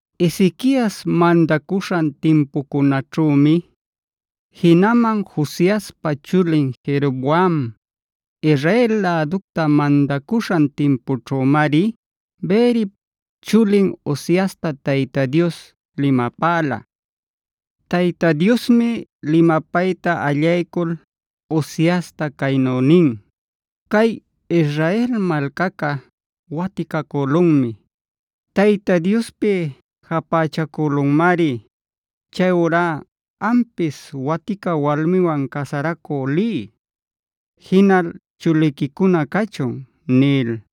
Ezequiasd mandacuśhan timpucunaćhümi, jinaman Joaspa chulin Jeroboame Israel läducta mandacuśhan timpućhümari Beerip chulin Oseasta Tayta Dios limapäla. Tayta Diosmi limapayta allaycul Oseasta caynu nin: “Cay Israel malcaca waticacülunmi. Tayta Diospi japächacülunmari. Chayurá ampis watica walmiwan casaracü liy. Jinal chuliquicuna cachun” nil.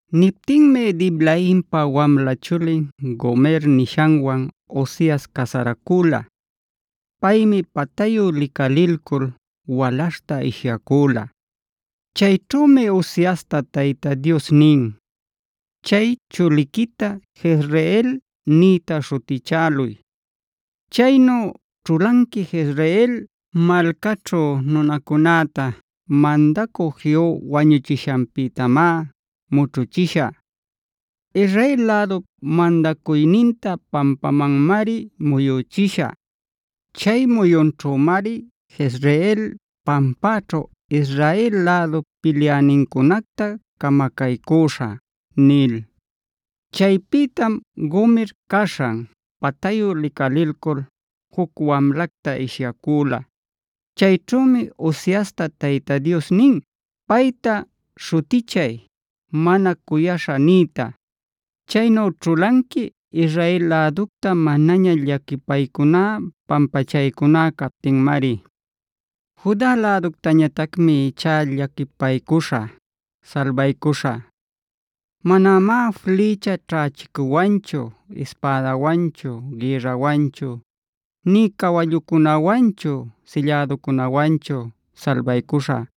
Niptinmi Diblaimpa wamla chulin Gomer nishanwan Oseas casaracüla. Paymi patayu licalilcul walaśhta ishyacüla. Chayćhümi Oseasta Tayta Dios nin: “Chay chuliquita ‘Jezreel’f nïta śhutichäluy.g Chaynu ćhulanqui Jezreel malcaćhu nunacunäta mandacü Jehu wañuchishanpïtamá mućhuchishä. Israel lädup mandacuyninta pampamanmari muyüchishä. Chay muyunćhümari Jezreel pampaćhu Israel lädup pilyänincunacta camacaycüśhä” nil. Chaypïtam Gomer caśhan patayu licalilcul juc wamlacta ishyacüla. Chayćhümi Oseasta Tayta Dios nin: “Payta śhutichay ‘Mana cuyaśha’h nïta. Chaynu ćhulanqui Israel läducta manaña llaquipaycuná, pampachaycuná captinmari. “Juda läductañatacmi ichá llaquipaycuśhä, salbaycuśhä. Manamá flïcha ćhächicuwanchu, ispädawanchu, gïrrawanchu, nï cawallucunawanchu, sillädacunawanchu salbaycuśhä,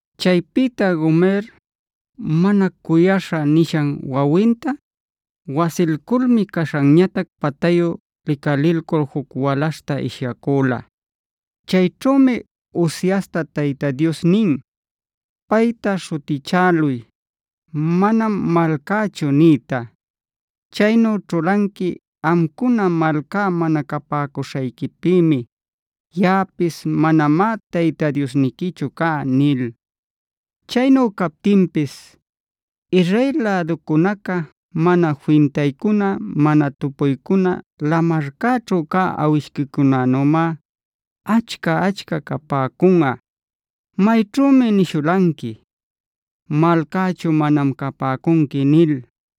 Chaypïta Gomer “Mana cuyaśha” nishan wawinta wasilculmi caśhanñatac patayu licalilcul juc walaśhta ishyacüla. Chayćhümi Oseasta Tayta Dios nin: “Payta śhutichäluy ‘Manam malcächu’j nïta. Chaynu ćhulanqui amcuna malcá mana capäcuśhayquipïmi; yaꞌapis manamá Tayta Diosniquichu cá” nil. Chaynu captinpis, Israel läducunaca mana fintaycuna, mana tupuycuna lamarcäćhu cä awishquicunänümá achca-achca capäcunꞌa.k Mayćhümi nishulanqui: “Malcächu manam capäcunqui” nil,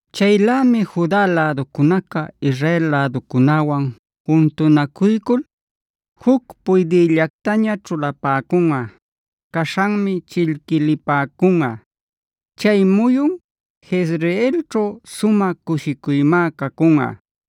Chaylämi Juda läducunaca Israel läducunäwan juntunacuycul, juc puydïllactaña ćhulapäcunꞌa. Caśhanmi chillquilipäcunꞌa. Chay muyun Jezreelćhu sumä cushicuymá cacunꞌa.